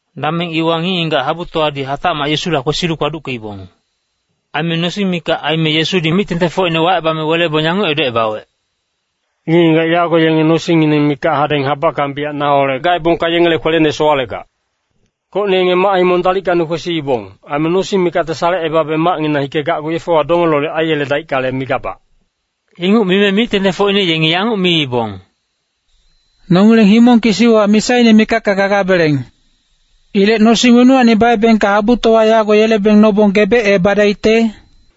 Dameng iwa ngic-ngigac habutowadi hatacmac Yesula kwesilu kpaduckeibong. Aime nosing mikac aime Yesudi mic-tengtengfocine wacebame welebong yanguc edocebawec, “Ngic-ngigac yago yenge nosingngineng mikac hadeng habackang biyac naholec gaebongka yengele kwelene sowalegac. Gocne yenge mac-himong dalickacni kwesiibong. Aime nosing mikacte salecebabe macnginang hikegacgu yefewa donge lolic aiyeledaickale, migabac.” Inguc mime mic-tengtengfocine yengi yanguc miibong, “Nongileng himong kisiwa misaine mikacka gagabeleng. Ilec nosing wenuwacni baebengka habutowa yago yelebeng nobong gebecebadaicte?”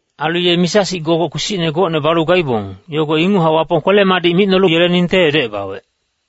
Ailu ye misa-sic gogoc kpisicne gocne balu gaibong, yogo inguchac Wapong kwele-madic micnolu yeleningte edocebawec.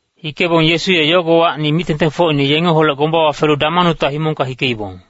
Hikebong Yesu ye yogowacni mic-tengtengfocine yengeholec gombawa felu Damanuta himongka hikeibong.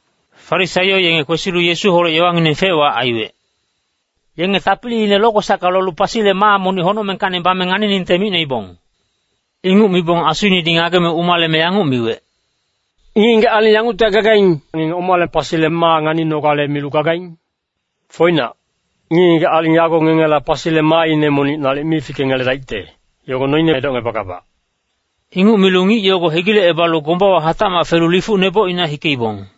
Farisaio yenge kwesilu Yesuholec yowangineng fec-wac aiwec. Yenge tapiliine lokwesacka lolu pasile maa monic honocmengkacni bame nganiningte micnoibong. Inguc mibong asuinedi ngageme umaleme yanguc miwec, “Ngic-ngigac aling yanguctihac gagaing, ngenge omale pasile maa nganinogale milu gagaing? Foinac, ngic-ngigac aling yago ngengela pasile maaine monic nalic mi fikengeledaicte, yogo noine edocngebagabac.” Inguc milu ngic yogo hegilecebalu gombawa hatacmac felu lifuc nebocina hikeibong.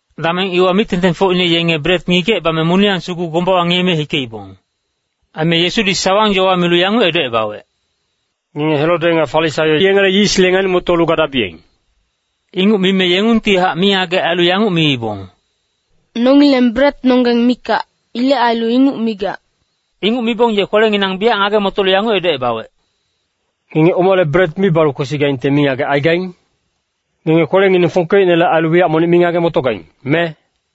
Dameng iwa mic-tengtengfocine yenge bret ngigecebame moniyang sugu gombawa ngiyeme hikeibong. Aime Yesudi sawang-yowa milu yanguc edocebawec, “Ngenge Herode nga Farisaio yengele yisle ngani-motolu gadabiyeng.” Inguc mime yengungtihac mingagec ailu yanguc miibong, “Nongileng bretnonggeng mikac. Ilec ailu inguc migac.” Inguc mibong ye kwelenginang biyac ngage-motolu yanguc edocebawec, “Ngenge omale bret mi balu kwesigaingte mingagec aigaing? Ngenge kwelengineng fongkeicnele ailu wiyac monic mi ngage-motogaing, me?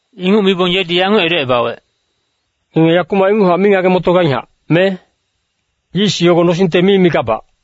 Inguc mibong yedi yanguc edocebawec, “Ngenge yakumac inguchac mi ngage-motogainghac, me? Yis yogo nosingte mi migabac.”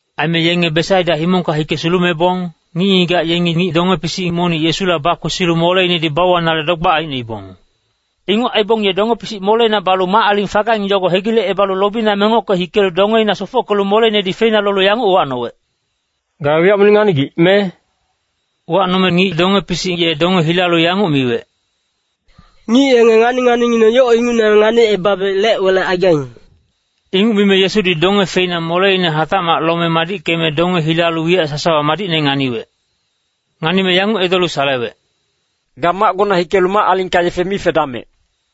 Aime yenge Besaida himongka hike sulumebong, ngic-ngigac yengi ngic donge-pisic monic Yesula bakwesilu moleinedi bauwanale dogbac aicnoibong. Inguc aibong ye donge-pisic moleina balu mac-aling fagaing yogo hegilecebalu lobina mengocke hikelu dongeina sofockelu moleinedi feina lolu yanguc uwacnowec, “Ga wiyac monic nganigic, me?” Uwacnome ngic donge-pisic ye donge hilalu yanguc miwec, “Ngic yenge ngani-nganingineng yoc ingucne nganicebabe lec-welec aigaing.” Inguc mime Yesudi donge feina moleine hatacmac lome madickeme donge hilalu wiyac sasawa madicne nganiwec. Nganime yanguc edolu salewec, “Ga macgona hikelu mac-alingka yefe mi fedamec.”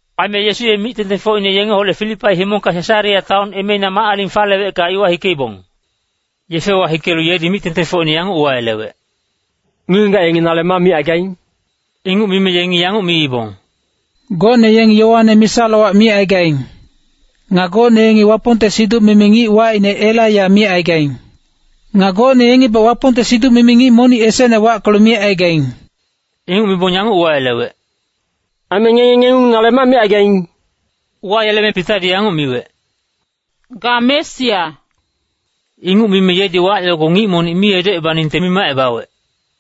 Aime Yesu ye mic-tengtengfocine yengeholec Filipai himongka Sesarea taon emeina mac-aling falewecka iwa hikeibong. Yefewa hikelu yedi mic-tengtengfocine yanguc uwayelewec, “Ngic-ngigac yengi nale ma micaigaing?” Inguc mime yengi yanguc miibong, “Gocne yengi Yoane misa-lowac micaigaing. Nga gocne yengi Wapongte siduc-mimi ngic wacine Elaiya micaigaing. Nga gocne yengibac Wapongte siduc-mimi ngic monic esecne wackelu micaigaing.” Inguc mibong yanguc uwayelewec, “Aime ngenge ngengung nale ma micaigaing?” Uwayeleme Pitadi yanguc miwec, “Ga Mesia.” Inguc mime yedi wac yogo ngic monic mi edocebaningte mimacebawec.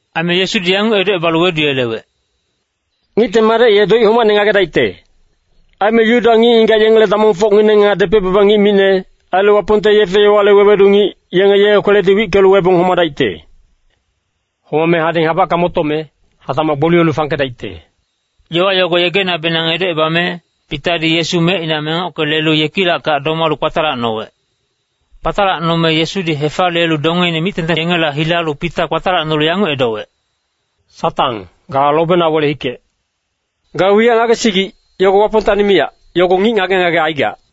Aime Yesudi yanguc edocebalu weduyelewec, “Ngicte Madec ye doic homacne ngagedaicte. Aime Yuda ngic-ngigac yengele damongfocngineng, nga depec-baba ngic micne, ailu Wapongte yefe-yowale wewedu ngic, yengi ye kweledi wickelu webong homadaicte. Homame hadeng habackang motome, hatacmac gboliyelu fangkedaicte.” Yowa yogo yegenabenang edocebame, Pitadi Yesu mecina mengocke lelu yekilackac domalu kpatalacnowec. Kpatalacnome Yesudi hefaliyelu dongeine mic-tengteng yengela hilalu Pita kpatalacnolu yanguc edowec, “Satang, ga lobena wele-hikec. Ga wiyac ngagesigic, yogo Wapongtacni miyac, yogo ngic ngage-ngage aigac.”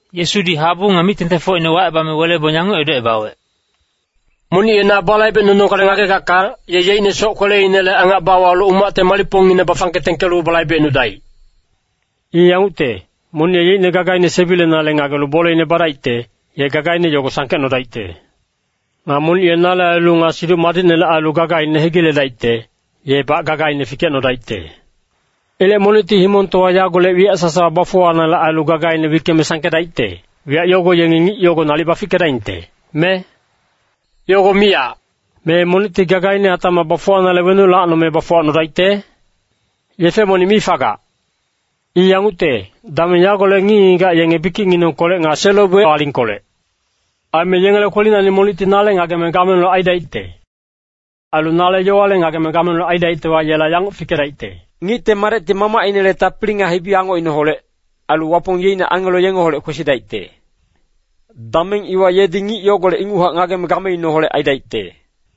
Yesudi habu nga mic-tengtengfocine wacebame welebong yanguc edocebawec, “Monic ye na balaibecnunogale ngagegacka, ye yeicne soc-kweleinele angac bawalu umacte malicpongine bafangke tengkelu balaibecnudaic. I yangucte, monic ye yeicne gagaine sebilenale ngagelu boleine badaicte, ye gagaine yogo sangkecnodaicte. Nga monic ye nale ailu nga Siduc Madicnele ailu gagaine hegiledaicte, yebac gagaine fikecnodaicte. Ilec monicti himongtowa yagolec wiyac sasawa bafuwanale ailu gagaine wickeme sangkedaicte, wiyac yogo yengi ngic yogo nalic bafickedaingte, me? Yogo miyac! Me monicti gagaine hatacmac bafuwanale wenuc lacnome bafuwacnodaicte? Yefe monic mi fagac. I yangucte, dameng yagolec ngic-ngigac yenge bikicnginengkolec nga selo-boic alingkolec. Aime yengele kwelinacni monicti nale ngageme gameineholec aidaicte. Ailu nale yowale ngageme gameineholec aidaictewa, yela yanguc fikedaicte. Ngicte Madecti Mamacinele tapili nga hibi-angocineholec, ailu Wapong yeicne angelo yengeholec kwesidaicte. Dameng iwa yedi ngic yogolec inguchac ngageme gameineholec aidaicte.”